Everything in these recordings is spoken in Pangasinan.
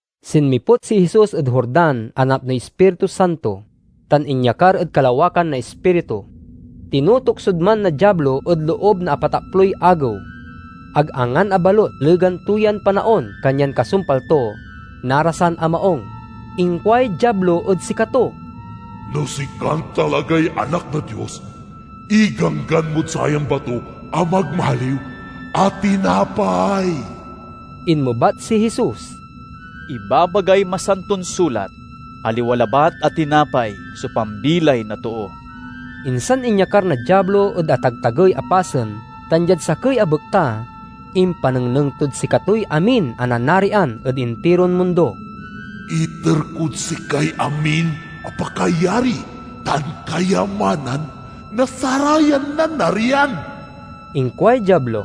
Sinmiput si Jesus ed Jordan a napnoy Ispiritu Santo, tan inyakar ed kalawakan na Ispiritu. Tinutuksod man na Diablo ed loob na apataploy agew. Ag angan a balut legan to yan panaon kanyan kasumpal to, narasan a maung. Inkuay Diablo ed sikato, "No sikan talagay Anak na Dios, iganggan mod sayan bato a magmaliw a tinapay." Inmebat si Jesus, "Ibabagay Masanton Sulat, 'Aliwa labat a tinapay so pambilay na too!'" Insan inyakar na Diablo ed atagtagey a pasen tan diad sakey a bekta, impanengneng tod sikatoy amin a nanarian ed intiron mundo. "Iter kod sikay amin a pakayari tan kayamanan na sarayan nanarian," inkuay Diablo.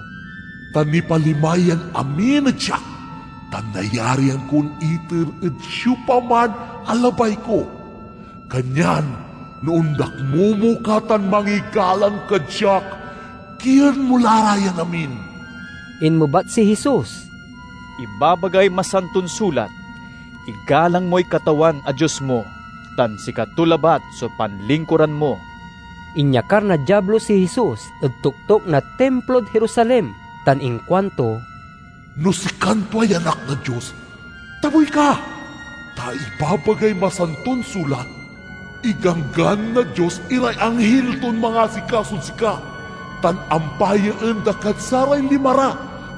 "Ta nipalima yan amin ed siak, tan nayarian kon iter ed siopaman a labay ko. Kanyan no ondakmomo ka tan mangigalang kad siak, kien mo la ra yan amin." Inmebat si Jesus, "Ibabagay Masanton Sulat, 'Igalang moy Katawan a Dios mo, tan sikato labat so panlingkuran mo!'" Inyakar na Diablo si Jesus ed toktok na Timplod Jerusalem tan inkuanto, "No sikan tuay Anak na Dios, tabuy ka! Ta ibabagay Masanton Sulat, 'Iganggan na Dios iray anghil ton mangasikasod sika'; tan 'Ampayaen da kad saray lima ra,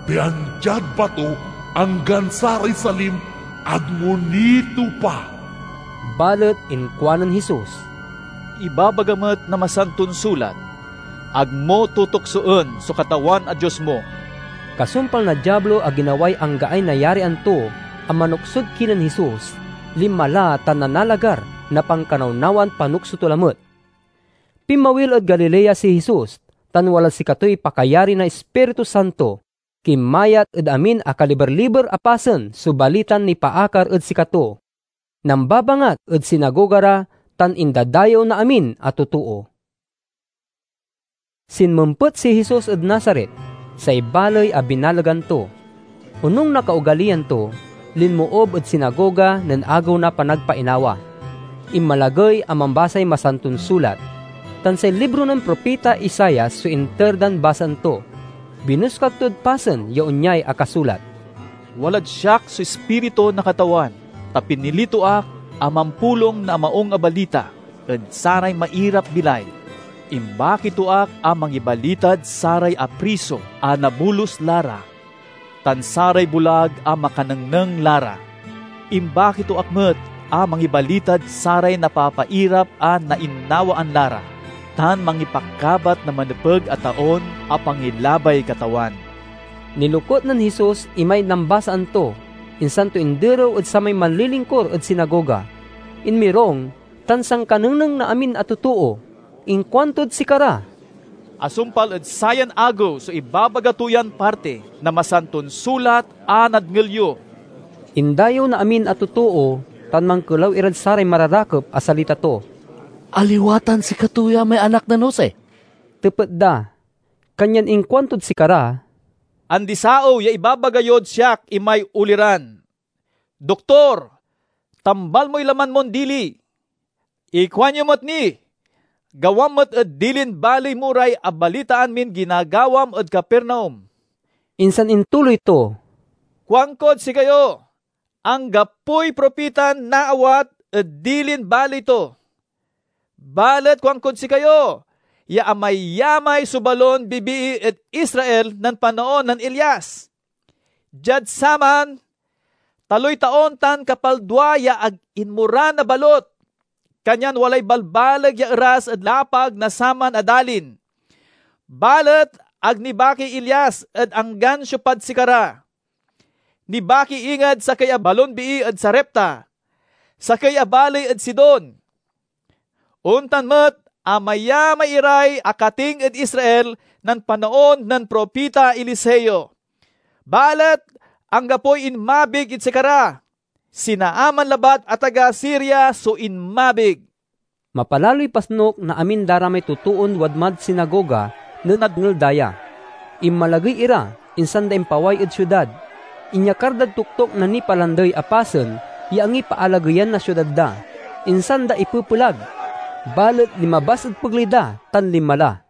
pian diad bato anggan saray salim ag mo nitopa.'" Balet inkuanen Jesus, "Ibabaga met na Masanton Sulat, 'Ag mo tutuksoen so Katawan a Dios mo!'" Kasumpal na Diablo a ginaway anggaay nayarian to a manuksod kinen Jesus, linma la tan nanalagar na pankanawnawan panukso to lamet. Pinmawil ed Galilea si Jesus, tan walad sikatoy pakayari na Ispiritu Santo. Kinmayat ed amin a kaliber-liber a pasen so balitan nipaakar ed sikato. Nambabangat ed sinagoga ra, tan indadayew na amin a totoo. Sinmempet si Jesus ed Nazaret, say baley a binalegan to. Onung na kaogaliyan to, linmoob ed sinagoga nen Agew na Panagpainawa. Inmalagey a mambasay Masanton Sulat, tan say libro nen propita Isaias so inter dan basaen to. Binoskag tod pasen ya onyay akasulat: "Walad siak so Ispiritu na Katawan, ta pinili to ak a mampulong na Maung a Balita ed saray mairap-bilay. Imbaki to ak a mangibalitad saray apriso a nabolus la ra, tan saray bulag a makanengneng la ra. Imbaki to ak met a mangibalitad saray napapairap a nainawaan la ra, tan mangipakabat na manepeg a taon a pangilabay Katawan." Nilokut nen Jesus imay nambasaan to, insan to inderew ed samay manlilingkur ed sinagoga. Inmirung, tan sankanengneng na amin a totoo. Inkuantod sikara, "Asumpal ed sayan agew so ibabaga to yan parti na Masanton Sulat a nadngel yo." Indayew na amin a totoo, tan mankelaw irad saray mararakep a salita to. "Aliwa tan sikato ya may anak nen Jose?" tepet da. Kanyan inkuantod sikara, "Andisaew ya ibaga yod siak imay oliran: 'Doktor, tambal moy laman mon dili!' Ikuanyo met ni, 'Gawam met ed dilin baley mo ray abalitaan min ginagawam ed Capernaum!'" Insan intuloy to, "Kuankod sikayo: anggapoy propitan naawat ed dilin baley to. Balet kuankod sikayo ya amayamay so balon bibii ed Israel nen panaon nen Elias. Diad saman, taloy taon tan kapaldua ya ag inmoran a balut, kanyan walay balbaleg ya eras ed lapag na saman a dalin. Balet ag nibakiy Elias ed anggan siopad sikara. Nibaki inged sakey a balon bii ed Sarepta, sakey a baley ed Sidon. Ontan met amayamay iray akating ed Israel nen panaon nen propita Eliseo, balet anggapoy inmabig ed sikara. Si Naaman labat a taga Siria so inmabig." Mapalaloy pasnuk na amin da ra may totoon wadmad sinagoga nen nadngel da ya. Inmalagey ira, insan da impaway ed siudad. Inyakar dad toktok na nipalandey a pasen ya angipaalageyan na siudad da, insan da ipepelag. Balet linmabas ed pegley da, tan linma la.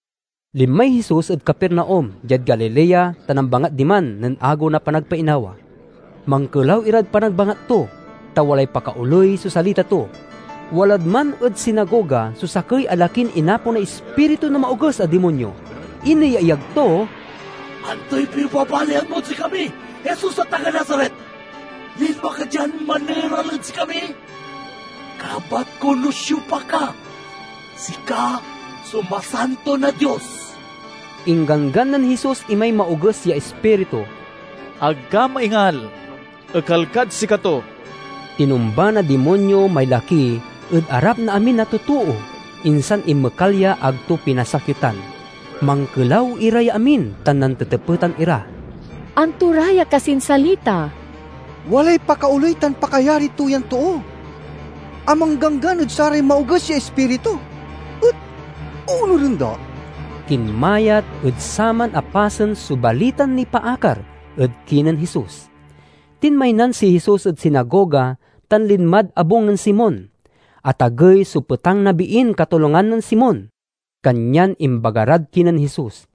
Linmay Jesus ed Capernaum, diad Galilea, ta nambangat diman nen Agew na Panagpainawa. Mankelaw irad panagbangat to, ta walay pakaoley so salita to. Walad man ed sinagoga so sakey a lakin inaponay ispiritu na maoges a dimonyo. Ineyaeyag to, "Antoy pibabalian mod sikami, Jesus a taga Nazaret? Linma ka dian maneral ed sikami? Kabat ko no siopa ka: sika so Masanto na Dios!" Ingganggan nen Jesus imay maoges ya ispiritu, "Ag ka maingal! Ekal kad sikato!" Tinumba na dimonyo may laki ed arap na amin a totoo, insan inmekal ya ag to pinasakitan. Mankelaw ira ya amin tan nantetepetan ira, "Anto ra ya kasin salita? Walay pakaoley tan pakayari to yan too a mangganggan ed saray maoges ya ispiritu, et oonuren da!" Kinmayat ed saman a pasen so balitan nipaakar ed kinen Jesus. Tinmaynan si Jesus ed sinagoga tan linmad abung nen Simon. Atagey so petang na biin katolangan nen Simon, kanyan imbaga rad kinen Jesus.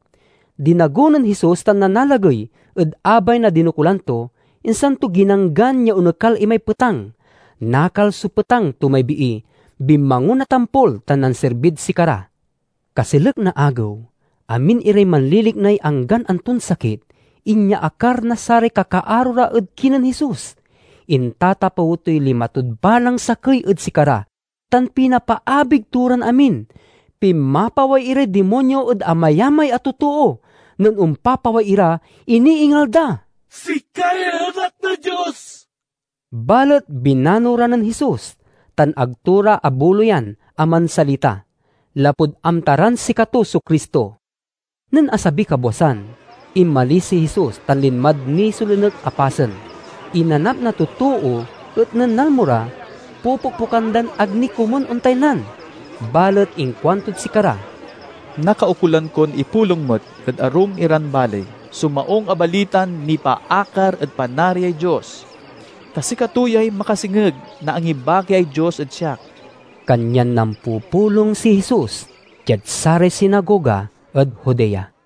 Dinago nen Jesus tan nanalagey ed abay na dinokulan to, insan to ginanggan ya onekal imay petang. Nakal so petang to may bii, binmangon a tampol, tan nansirbid sikara. Kaselek na agew, amin iray manliliknay anggan anton sakit inyaakar na saray kakaaro ra ed kinen Jesus. Intatapew toy lima tod balang sakey ed sikara, tan pinapaabig to ran amin. Pinmapaway iray dimonyo ed amayamay a totoo. Nen ompapaway ira, iniingal da, "Sikay Anak na Dios!" Balet binano ra nen Jesus, tan ag to ra abuloyan a mansalita, lapud amta ran sikato so Cristo. Nen asabiy kabwasan, inmalis si Jesus tan linmad nisolinek a pasen. Inanap na totoo, et nen nalmo ra, popokpokan dan ag ni komun ontaynan. Balet inkuantod sikara, "Nakaukolan kon ipulong met ed arum iran baley so Maung a Balitan nipaakar ed Panariay Dios, ta sikato yay makasengeg na angibakiay Dios ed siak." Kanyan nampupulong si Jesus diad saray sinagoga ed Judea.